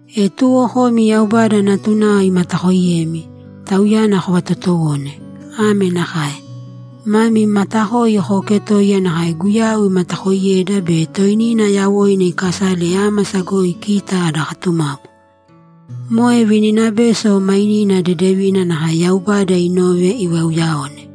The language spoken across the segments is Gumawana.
E tuwo komi Yaubada natunao imatakooiyemi, Tauyana kovatotowōne. Ame nakae: Mami matakoi kooketōiya nakae Guyau imatakoiyeda be toinina yawoina ikasale ámasa goi kita ada katumapu. Moe vininabeso mainina dedevina nakae Yaubada inove ivauyaone.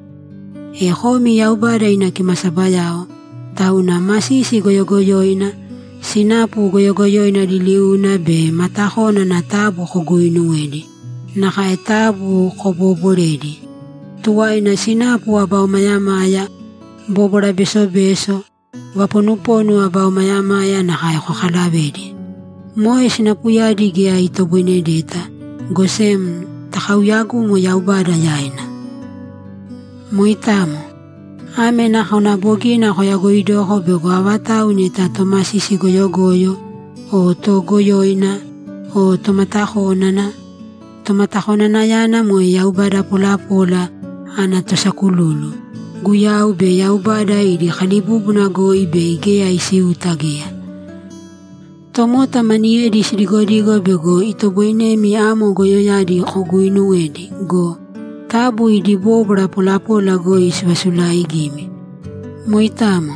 E komi Yaubada ina kimasabayao, tauna masisi goyogoyoina, sinapu goyogoyoina liliuna be matakónana taabu koguuinuwēdi, nakae taabu kobooborēdi! Tuwaina sinapu aba omayamaya, bóbwara besobeso, vaponuponu aba omayamaya nakae kokalavēdi. Moe sinapuyadi geya itoboinedeta, go sem takauyagūmo Yaubada yaina. Moitamo. Ame nakona bogina koyagoidoko bego avatau neta tomasisi goyogoyo o toogoyoina o tomatakónana (Tomatakonanayana moe yaubada polapola ana tosakululu) Guyau be Yaubada idi kalibúbuna goi bei geya isiuta geya. Tomota maniyedi sidigodigo bego itoboinemi amo goyoyadi koguinuwedi go, taabu idi bóbwara polapola goi sivasulaaigīmi. Moitamo.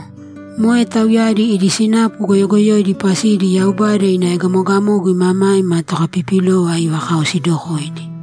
Moe tauyadi idi sinapu goyogoyoidi pasidi Yaubada ina egamogamogu imamaima tokapipilova ivakaosidokoidi.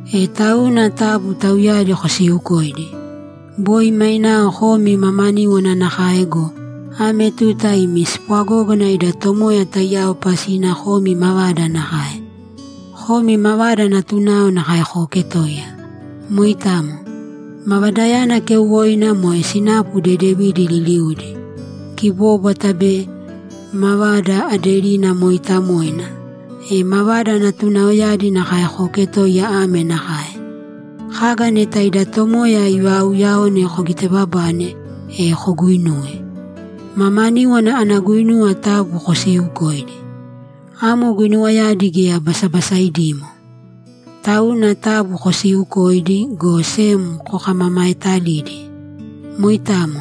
E tauna taabu tauyadi kosiiukōidi. Boi mainao komi mamaníwana nakae go, ame tuta imi spwagógana ida Tomoya taiyao pasina komi mavada nakae. Komi mavada natunao nakae kooketōiya. Moitamo. Mavadayana keuwoina moe sinapu dedevidi liliudi, kibóbwata be mavada aderina mooitamoina. E mavada natunaoyadi nakae kooketōiya ame nakae: Kaga neta ida Tomoya ivaauyaone kogitebabāne, e koguinūwe. Mamaníwana ana guinuwa taabu kosiiukōidi. Amo guinuwayadi geya basabasaidimo. Tauna taabu kosiiukōidi, go sem kokamamaetalīdi. Moitamo.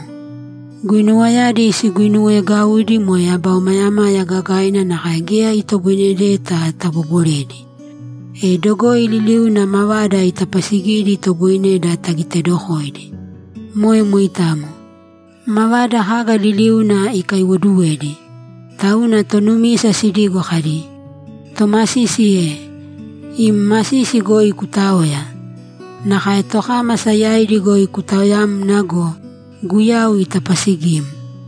Guinuwayadi siguinuweegaudi moe aba omayamaya gagaina nakae geya itoboinedeta tabooboredi. E dogoi liliuna mavada itapaasigidi itoboineda tagitedokoidi. Moe moitamo. Mavada kaga liliuna ikaiwoduwedi. Tauna tonumisa sidigo kadi, ‘Tomasisi e! Im masisi goi kutāoya! Nakae tokámasa yaidi goi kutaoyāmna go, Guyau itapasigim.’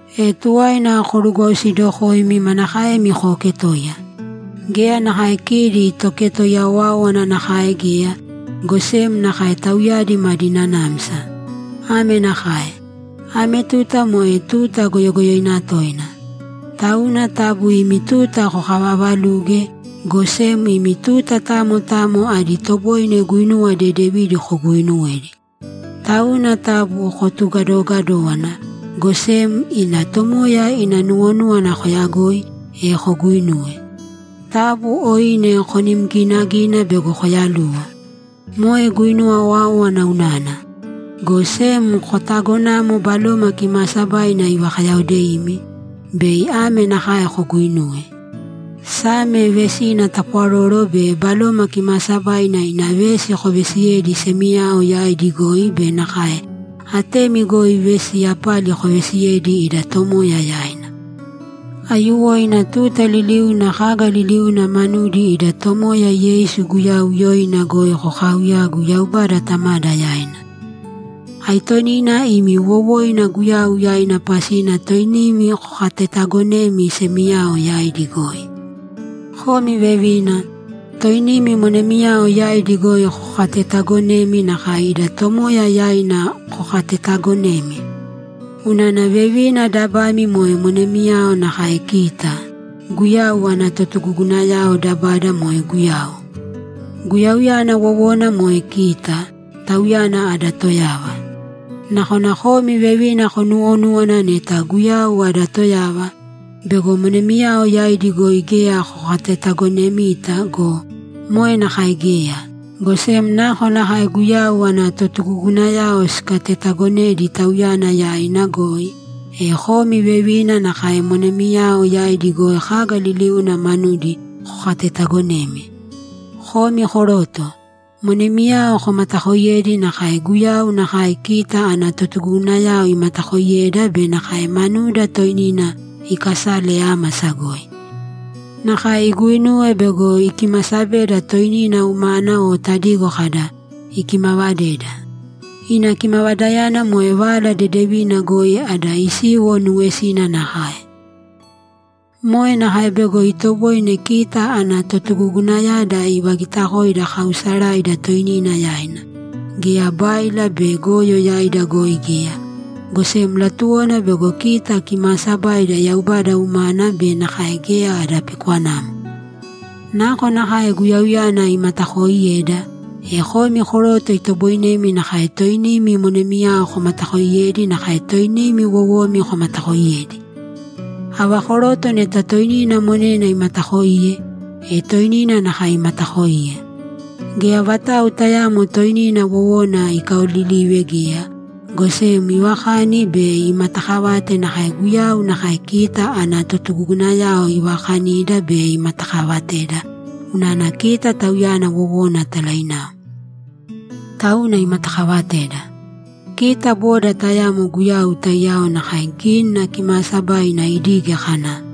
E tuwaina korugwausidokōimi manakaemi kooketoiya. Geya nakae kidi toketoiya owáowana nakae geya, go sem nakae tauyadi madi nanamsa. Ame nakae: Ame tuta moe tuta goyogoyoina toina. Tauna taabu imi tuta kokavaavalūge, go sem imi tuta tamo tamo adi toboine guinuwa dedevidi kuguinuwēdi. Tauna taabu kotugadoogadōwana, go sem ida Tomoya ina nuwonúwana koyagōi, e koguinūwe. Taabu oine konim ginagīna bego koyaluwo. Moe guinuwa owáowana unana. Go sem kotagonāmo Baloma Kimaasabaina ivakayaodeimi, bei ame nakae koguuinūwe: Same, vesi tapwaroro be Baloma Kimaasabaina ina vesi koveesiyēdi semiyao yaidi goi be nakae atemi goi vesi yapali koveesiyēdi ida Tomoya yaina. Aiyuwoina tuta liliuna kaga liliuna manudi ida Tomoya Yeisu Guyau yoina goi kokaauyāgu Yaubada Tamada yaina. Aitonina imi wowoina Guyau yaina pasina toinimi kokatetagonēmi semiyao yaidi goi. Komi vevina, toinimi monemiyao yaidi goi kokatetaagonēmi nakae ida Tomoya yaina kokatetaagonemi. Unana vevina dabami moe monemiyao nakae kita, Guyau ana totugugunayao, dabada moe Guyau. Guyauyana wowona moe kita, Tauyana ada toyava. Nakona komi vevina konuwonúwana neta Guyau ada toyava, bego monemiyao yaidi goi geya kokatetagonemita go, moe nakae geya, go sem nakonakae Guyau ana totugugunayao sikatetaagonedi Tauyana yaina goi, e komi vevina nakae monemiyao yaidi goi kaga liliuna manudi kokatetaagonēmi. Komi koroto, monemiyao komatakooiyēdi nakae Guyau nakae kita ana totugugunayao imatakooiyeda be nakae manuda toinina ikasale ámasa goi. Nakae iguinuwe bego ikimasabeda toinina umana o tadigo kada, ‘Ikimavadeda.’ Ina kimavadayana moe Vala Dedevina goi ada isiwo nuwesina nakae. Moe nakae bego itoboine kita ana totugugunayada ivagitakoida kaausaraida toinina yaina, geya báila be goyo yaida goi geya, go sem latuwona bego kita kimaasabaida Yaubada umana be nakae geya ada pikwanamo. Nakonakae Guyauyana imatakooiyeda, e komi koroto itoboinemi nakae toinimi monemiyao komatakooiyedi nakae toinimi wowomi komatakooiyedi. Ava koroto neta toinina monena imataakoiye, e toinina nakae imataakoiye. Geya vatau tayaamo toinina wowona ikaolilive geya, go sem ivakani be imatakavate nakae Guyau nakae kita ana totugugunayao ivaakanida be imatakavateda unana kita Tauyana wowona talainao. Tauna imatakaavateda. Kita boda tayamo Guyau taiyao nakae Gínina Kimaasabaina idige kana,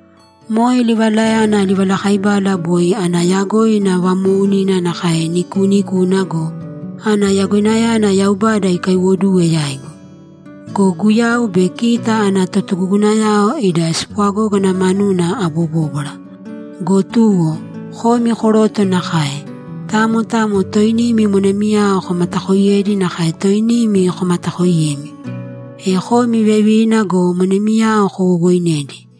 Moe livalayana livalakaibala boi ana yagoina vamoounina nakae nikuunikuna go, ana yagoinayana Yaubada ikaiwoduwe yaigu. Go Guyau be kita ana totugugunayao ida spwagógana manuna abobóbwara. Go tuwo, komi koroto nakae, tamo tamo toinimi monemiyao komatakoiyēdi nakae toinimi komatakoiyemi. E komi vevina go monemiyao kowowoinēdi.